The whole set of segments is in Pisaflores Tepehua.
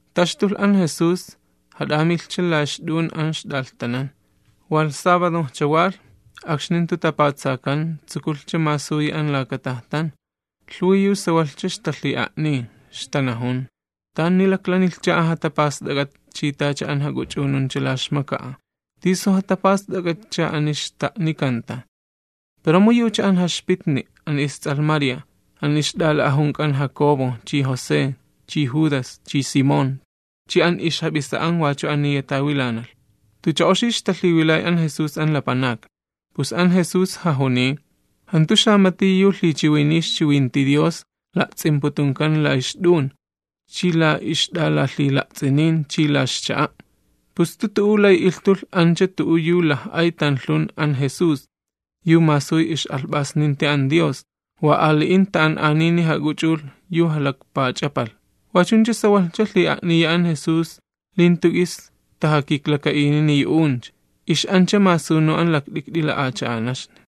Taxtulh an Jesús, jat'amilhcha la ixt'un an ixt'alhtanan. Walh, akxni jantu tapatsakan wilhchan, tsukulhcha masuyi an laka tajtan. Lhuwi yu sawalhcha ixtalhi'a'niy. Ixtanajun: ―¿Tani laklanilhcha an jatapast'ak'at chi tacha an jak'uch'ununcha la ixmaka'a? ¿Tisu jatapast'ak'atcha ani xta'nikanta? Pero mu yucha an jaxpitni', an ists'alh María, an ixt'ala'ajunk'an Jacobo chi José chi Judas chi Simón chi an ixjap'isa'an wachu aniya tawilanalh. Tucha oxi ixtalhiwilay an Jesús an lapanakni. Pus an Jesús jajuniy: ―Jantu xamati yu lhichiwiniy ixchiwinti Dios la'ts'imputunkan la ixt'un chi la ixt'alalhila'ts'inin chi la ixcha'a'. Pus jantu tu'u lay ilhtulh ancha tu'u yu laj'ay tanlhun an Jesús, yu masuy ix'alhp'asninti an Dios, wa ali'in ta'an'anini jak'uch'ulh yu jalakpach'apalh. Wachuncha sawalhcha lhi'a'niya an Jesús li jantu k'is tajakiklaka'inini yu'uncha. Ix'ancha masunu an lakt'ikt'i la'acha'anaxni.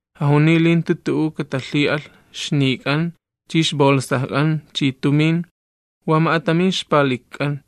Jajuniy li jantu tu'u katalhi'alh, ixnik'an, chi ixbolsajk'an chi tumin, wa ma'atamin ixpalikk'an,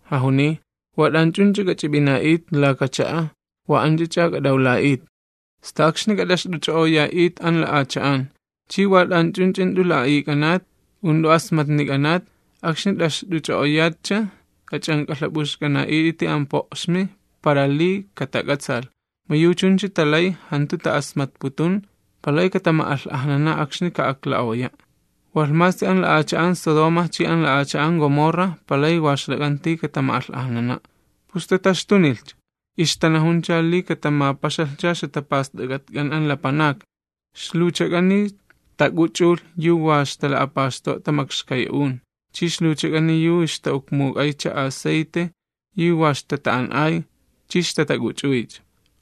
Jajuniy: ―Wa t'anch'unch'a k'ach'ip'ina'it laka cha'a wa anch'ach'a k'at'awla'it, sta akxni k'at'axt'uch'o'oya'it an la'acha'an. Chi wa t'anch'unch'a jant'u la'a'ik'anat, u jant'u asmatnik'anat, akxni t'axt'uch'o'oyatcha, k'ach'ank'alhap'uxk'ana'it'iti an po'xmi para li katak'atsaalh, mu yu chuncha talay jantu ta'asmatputun, [palay katama'alh'ajnana akxni ka'ukla'oya', walh masi an la'acha'an Sodoma chi an la'acha'an Gomorra palay wa ixlak'anti katama'alh'ajnana']. Pus tataxtunilhcha, ixtanajuncha li katamapaxalhcha ixjatapast'ak'atk'an an lapanakni. Ixluwchak'ani tak'uch'ulh yu wa ixtala'apaxt'o'a makxkay'un, chi ixluchak'ani yu ixta'ukmuk'aycha asayte yu wa ixtata'an'ay, chi ixtatak'uch'uycha.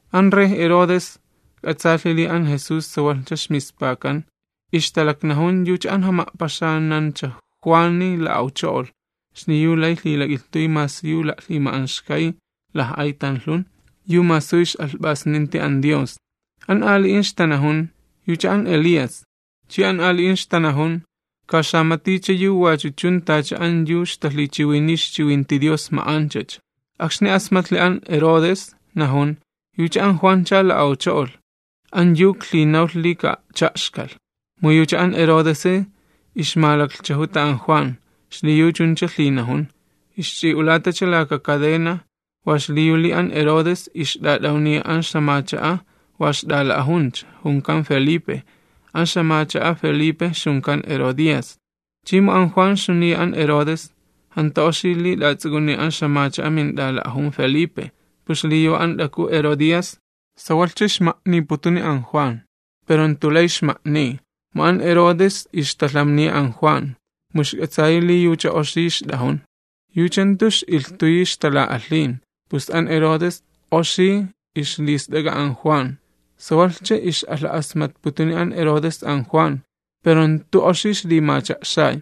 An rey Herodes k'atsaalhi li an Jesús sawalhcha ixmispakan. Ixtalaknajun yucha an ixjama'paxanancha Juani la'awcho'olh xliyu lay lhilak'ilhtuy masi yu la'lhima'anxkay laj'ay tanlhun, yu masuy ix'alhp'asninti an Dios. An ali'in ixtanajun: ―Yucha an Elías. Chi an ali'in ixtanajun: ―Ka xamaticha yu wachu chun tacha an yu ixtalhichiwiniy ixchiwinti Dios ma'anchacha. Akxni asmatlhi an Herodes, najun: ―Yucha an Juancha la'awcho'olh an yu iklhinawlh li ka'a'cha'xkalh. Mu yucha an Herodesi ixmalaklhchajuta an Juan, xliyu chuncha lhinajun, ixch'i'ulatacha laka kadena, wa xliyu li an Herodes ixt'at'awniya an ixt'iwi wa ixt'ala'ajuncha, junkan Felipe, an ixjamach'a Felipe ixjunkan Herodías. Chi mu an Juan ixjuniya an Herodes: ―Jantu oxi li t'ats'uk'uniy an ixt'iwi mint'ala'ajun Felipe. Pus xliyu an t'aku Herodías sawalhcha ixma'niputuni an Juan, pero jantu lay ixma'niy. Mu an Herodes ixtalhamniya an Juan, mu ixk'atsayi li yucha oxi ixt'ajun, yucha jantu ix'ilhtuyi ixtala'alhin, pus an Herodes oxi ixlist'ak'a an Juan. Sawalhcha ix'alha'asmatputuni an Herodes an Juan, pero jantu oxi ixlimacha'xay.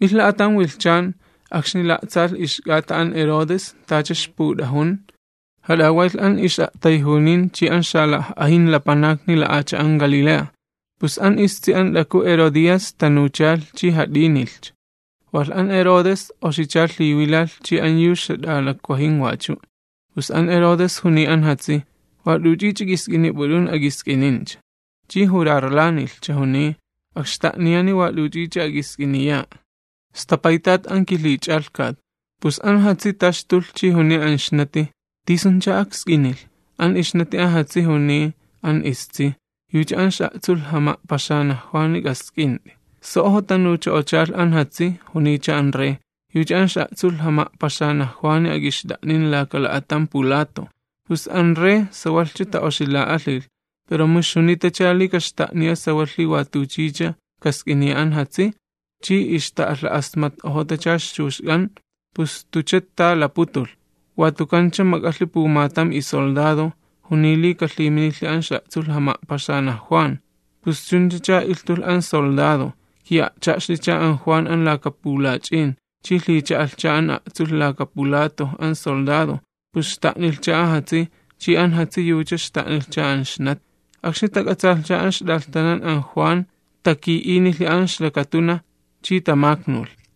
Milh la'atam wilhchan akxni la'tsapalhcha k'ata an Herodes tacha ixput'ajun, jat'awaylh an ix'a'tayjunin chi an xalaj'ajin lapanakni xalakaat'un Galilea. Pus an istsi an t'aku Herodías tanuchalh chi jat'ínilhcha. Walh an Herodes oxicha lhiwilalh chi an yu ixjat'alakwajin wachu', pus an Herodes juniy an jatsi: ―Wa t'uch'ich'a k'isk'inip'ut'un, ak'isk'inincha. Chi jurarlanilhcha, juniy: ―Akxta'niyani wat'uch'ich'a ak'isk'iniya'a, sta paytat an kilhich'alhkat. Pus an jatsi taxtulh chi juniy an ixnati: ―¿Tisuncha aksk'inilh? An ixnati an jatsi juniy an istsi: ―Yucha an ix'a'tsulh jama'paxanaj Juani k'ask'int'i. So'ojo tanucho'ochalh an jatsi, juniycha an rey: ―Yucha an ix'a'tsulh jama'paxanaj Juani ak'ixt'a'nin laka la'atam pulatoj. Pus an rey sawalhcha ta'oxila'alhilh, pero mu ixjunitacha li kaxta'niya sawalhi watuchicha kask'iniya an jatsi, chi ixta'alha'asmat'ojotacha ixchuxk'an, pus jantucha ta laputulh. Watukancha mak'alhi pumatam isoldado, juniy li kalhiminilhi an ix'a'tsulh jama'paxanaj Juan. Pus chunchacha ilhtulh an soldado. Ki'a'cha'xlicha an Juan an laka pulach'in. Chi lhicha'alhcha an a'tsulh laka pulatoj an soldado, pus xta'nilhcha an jatsi', chi an jatsi yucha xta'nilhcha an ixnati. Akxni tak'atsaalhcha an ixt'alhtanan an Juan, taki'inilhi an ixlakatunaj, chi tamaknulhcha.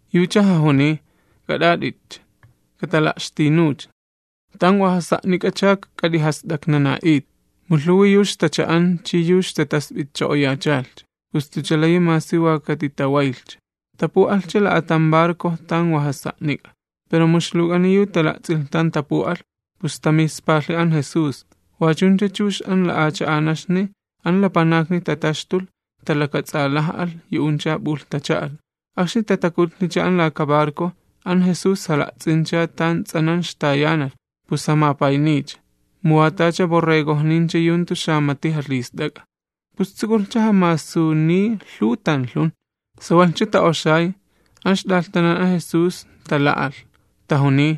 Yucha jajuniy: ―K'at'at'itcha, katala'xtinuw, tan wa jasa'nik'acha k'at'ijast'aknana'it. Mu lhuwi yu ixtacha'an chi yu ixtatasp'itcho'oyachalhcha, pus jantucha layi masi wa katitawaylhcha. Tapu'alhcha la'atam barco tan wa jasa'nik'a. Pero mu ixluwk'ani yu tala'ts'ilh tan tapu'alh. Pus tamispalhi an Jesús, wachuncha chux an la'acha'anaxni an lapanakni tataxtulh talakats'alaj'alh, yu'uncha p'ulh tacha'alh. Akxni tatakutlhicha an laka barco, an Jesús jala'tsincha tan ts'anan ixtayanalh, pus jamapayniycha, mu wa tacha borregojnincha yu jantu xamati jalhist'ak'a. Pus tsukulhcha jamasuniy lhuw tanlhun. Sawalhcha ta'oxay, an ixt'alhtanan an Jesús tala'alh, tajuniy: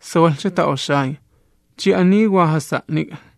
―Sawalhcha ta'oxay, chi ani wa jasa'nik'a.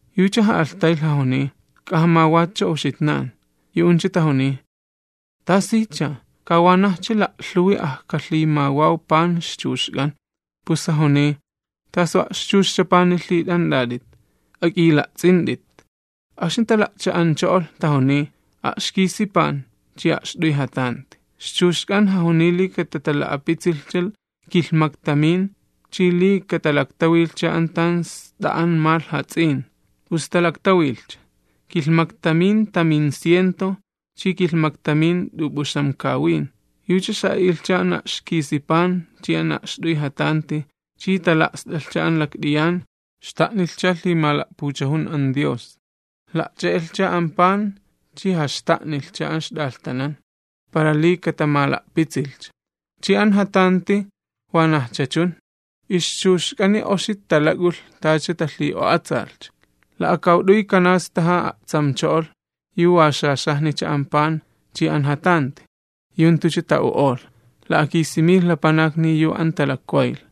Yucha ja'alhtaylh, jajuniy: ―K'ajamawatcha uxitnan. Yu'uncha tajuniy: ―¿Tasicha? Ka wanajcha la'lhuwi ajkalhimawaw pan ixchuxk'an. Pus jajuniy: ―¿Tasu a'xchuxcha pani lhit'ant'at'it? Ak'ila'ts'int'it. Akxni tala'cha'ancho'olh, tajuniy: ―A'xkisi pan chi ma'at'uy jatanti. Ixchuxk'an jajuniy li katatala'apitsilhcha kilhmaktamin, chi li katalaktawilhcha an tan st'a'an malh jats'in. Pus talaktawilhcha, kilhmaktamin taminciento chi kilhmaktamin t'up'uxamkawin. Yucha xa'a'ilhcha an a'xkisi pan chi an ma'at'uy jatanti chi tala'st'alhcha an lakt'iyan, xta'nilhcha lhimala'puchajuni an Dios. La'ch'e'elhcha an pan chi jaxta'nilhcha an ixt'alhtanan para li katamala'pitsilhcha, chi an jatanti wanajcha chun. Ixchuxchak'ani oxi talak'ulh tacha talhikiklalhcha. La'akawt'uy kanastaja a'tsamcho'olh yu wa xaxajnicha an pan chi an jatanti, yu jantucha ta'u'olh. La'akisi milh lapanakni yu an talakwaylh.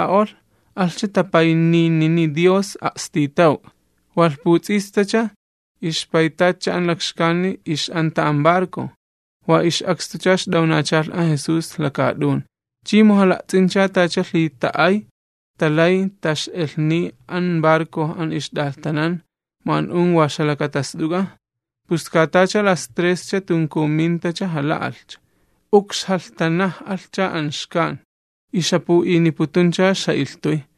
Jala'axa'ala'olh, alhcha tapayninini Dios a'stitawk'a. Walh puts'istacha, ixpaytatcha an lakxkani ix'anta an barco. Wa ix'akstucha ixt'awnachalh an Jesús lakaat'un. Chi mu jala'ts'incha tacha lhita'ayj talay tax'elhniy an barco an ixt'alhtanan, mu an un wa ixjalakatast'uka, pus ka tacha las trescha tunkunmintacha jala'alhcha. Ukxjalhtanaj'alhcha an xkan, ixjapu'iniputuncha ixja'ilhtuy.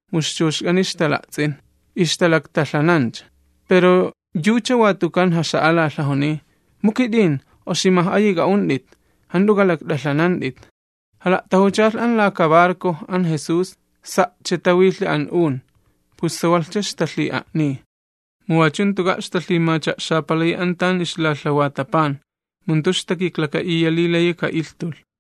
Mu ixchuxchak'ani ixtala'ts'in ixtalaktalhanancha, pero yucha watukan jaxa'alalh, jajuniy: ―¡Oximaj'ayi k'a'unt'it, jant'u k'alakt'alhanant'it, mu kit'in! Jala'tajuchalh an laka barco an Jesús, sa'cha walhi an un, pus sawalhcha ixtalhi'a'niy, mu wachuka jantuka' ixtalhimacha'xapalayi an tan ixlalhawata pan, mu jantu ixtakiklaka'iya li layi ka'ilhtulh.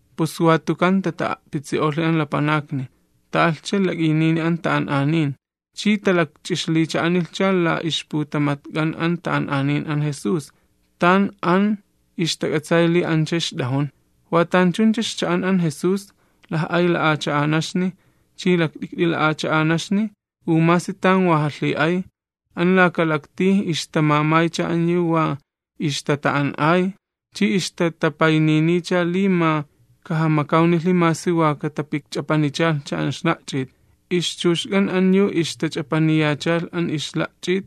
Pus watukan tata'a'pitsi'olhi an lapanakni, ta'alhcha lak'iynini an ta'an'anin, chi talakch'ixlicha'a'nilhcha la ixputamatk'an an ta'an'anin an Jesús, tan an ixtak'atsay li ancha ixt'ajun. Watanchuncha ixcha'an an Jesús, laj'ay la'acha'anaxni, chi lakt'ikt'i la'acha'anaxni, u masi tan wa jalhi'ay, an laka laktij ixtamamaycha an yu wa ixtata'an'ay chi ixtatapayniniycha li ma kajamakawnilhi masi wa katapikch'apanichalhcha an ixla'ch'it. Ixchuxk'an an yu ixtach'apaniyachalh an ixla'ch'it,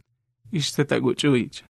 ixtatak'uch'uycha.